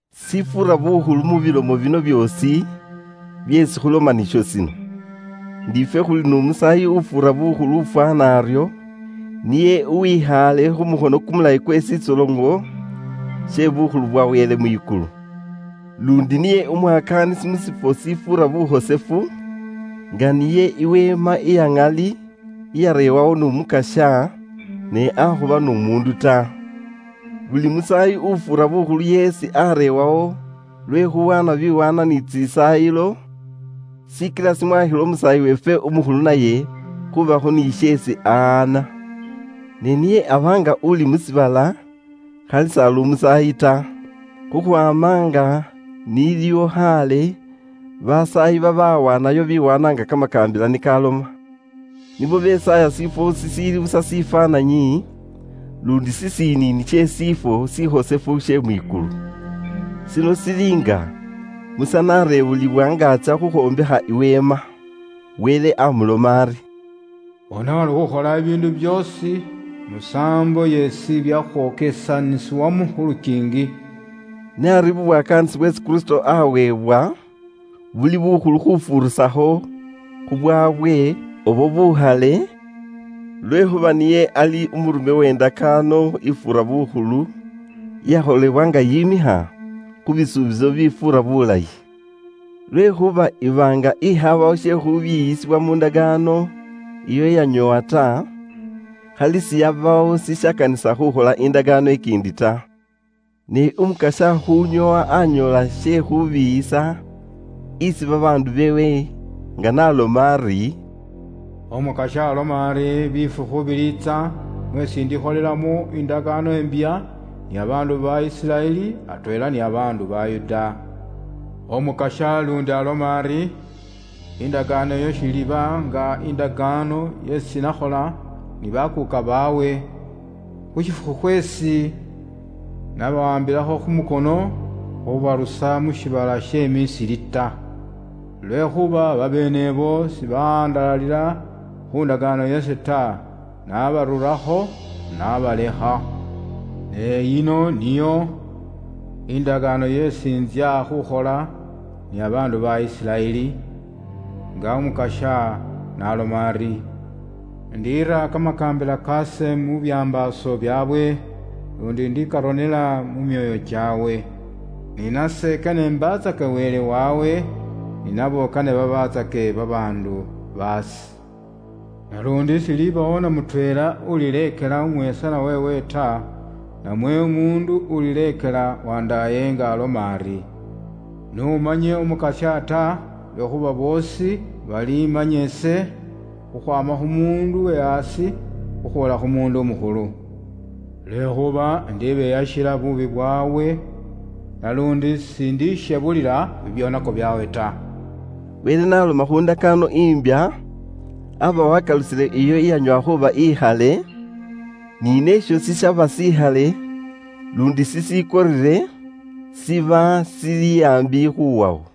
Shifuura bukhulu mu bilomo bino byoosi byeesi khuloma nisho shino: ndi ifwe khuli n'Umusaayi ufuura bukhulu ufwaana aryo, niye uwikhaale khu mukhono kumulayi kwe shitsoloŋo she bukhulu bwa Wele mwikulu. Luundi niye umwakaanisi mu shifwo shifuura bukhosefu, nga niyo iweema iya ŋali iyareewawo n'Umukasya, ne akhuba n'umuundu ta. Buli musaayi ufuura bukhulu yeesi areebwawo lwe khuuwaana biwaanwa ni tsisaayilo, shikila shimwaakhila Umusaayi weefwe Umukhulu naye khuubakho ni sheesi ahaana. Ne niye aba nga uli mu shiibala khali s'ali umusaayi ta, khukhwaama nga n'iliwo khaale basaayi babawaanayo biwaanwa nga kamakaambila ni kaloma. Nibo besaaya shifwo shishiili busa shifwaananyi, luundi shishiniini she shifwo shikhosefu she mwikulu. Shino shili nga Musa n'areewulibwa nga atsya khukhwombekha i weema. Wele amuloma ari, “Bona uri ukhola bibiindu byoosi musaambo yeesi byakhwokesanisibwamo khu lukiingi.” Ne ari bubwakaanisi bweesi Kristo aweebwa buli bukhulu khufuurisakho khubwaabwe ubwo bukhale, lwekhuuba niye ali umurume we ndakaano ifuura bukhulu, iyakholebwa nga yimikha khu bisuubiso bifuura bulayi. Lwekhuuba iba nga indakaano ingiboole iyaba nga indayi, khali siyabawo shishikanisa khuukhola indakaano ikiindi ta. Ne Umukasya khuunyoowa anyoola she khuubiiyisa isi babaandu beewe nga n'aloma ari, “Umukasya aloma ari, ‘bifukhu biliitsa mweesi indikholelamo indakaano imbya ni babaandu ba Isiraeli atweela ni babaandu ba Yuda.’” Umukasya luundi aloma ari, “Indakaano iyo shiliiba nga indakaano yeesi nakhola ni bakuuka baabwe, khu shifukhu khweesi nabawaambila khu mukhono khubarusa mu shiibala she Misiri ta. Lwekhuuba babeene ibo sibahandalalila khu ndakaano yase ta, nabarurakho nabalekha. Ne yino niyo indakaano yeesi intsya khukhola ni babaandu ba Isiraeli. Nga Umukasya n'aloma ari, ‘indiira kamakaambila kaase mu byambaaso byaabwe, luundi indikarona mu myoyo kyaabwe. Ni nase kane imbaatsake Wele waabwe, ni nabo kane babaatsake babaandu baase.’ Naluundi s'ilibawo na mutweela ulileekela umwesanwa weewe ta, namwe umuundu ulileekela wandaaye nga aloma ari, ‘N'umanye Umukasya’ ta, lwekhuuba boosi balimanya ise, khukhwaama khu muundu uwe aasi khukhwoola khu mukhulu. Lwekhuuba ise indibeyakhila nibo bibyoonako byaabwe, naluundi ise sindishebulila bubwoonaki bwaabwe ta.” Wele n'aloma khu ndakaano imbya, aba wakalusile iyo iyanyoowa khuuba ikhale, ni neesho shishiiba shikhale luundi shishikorere, shiba shili aambi khuwawo.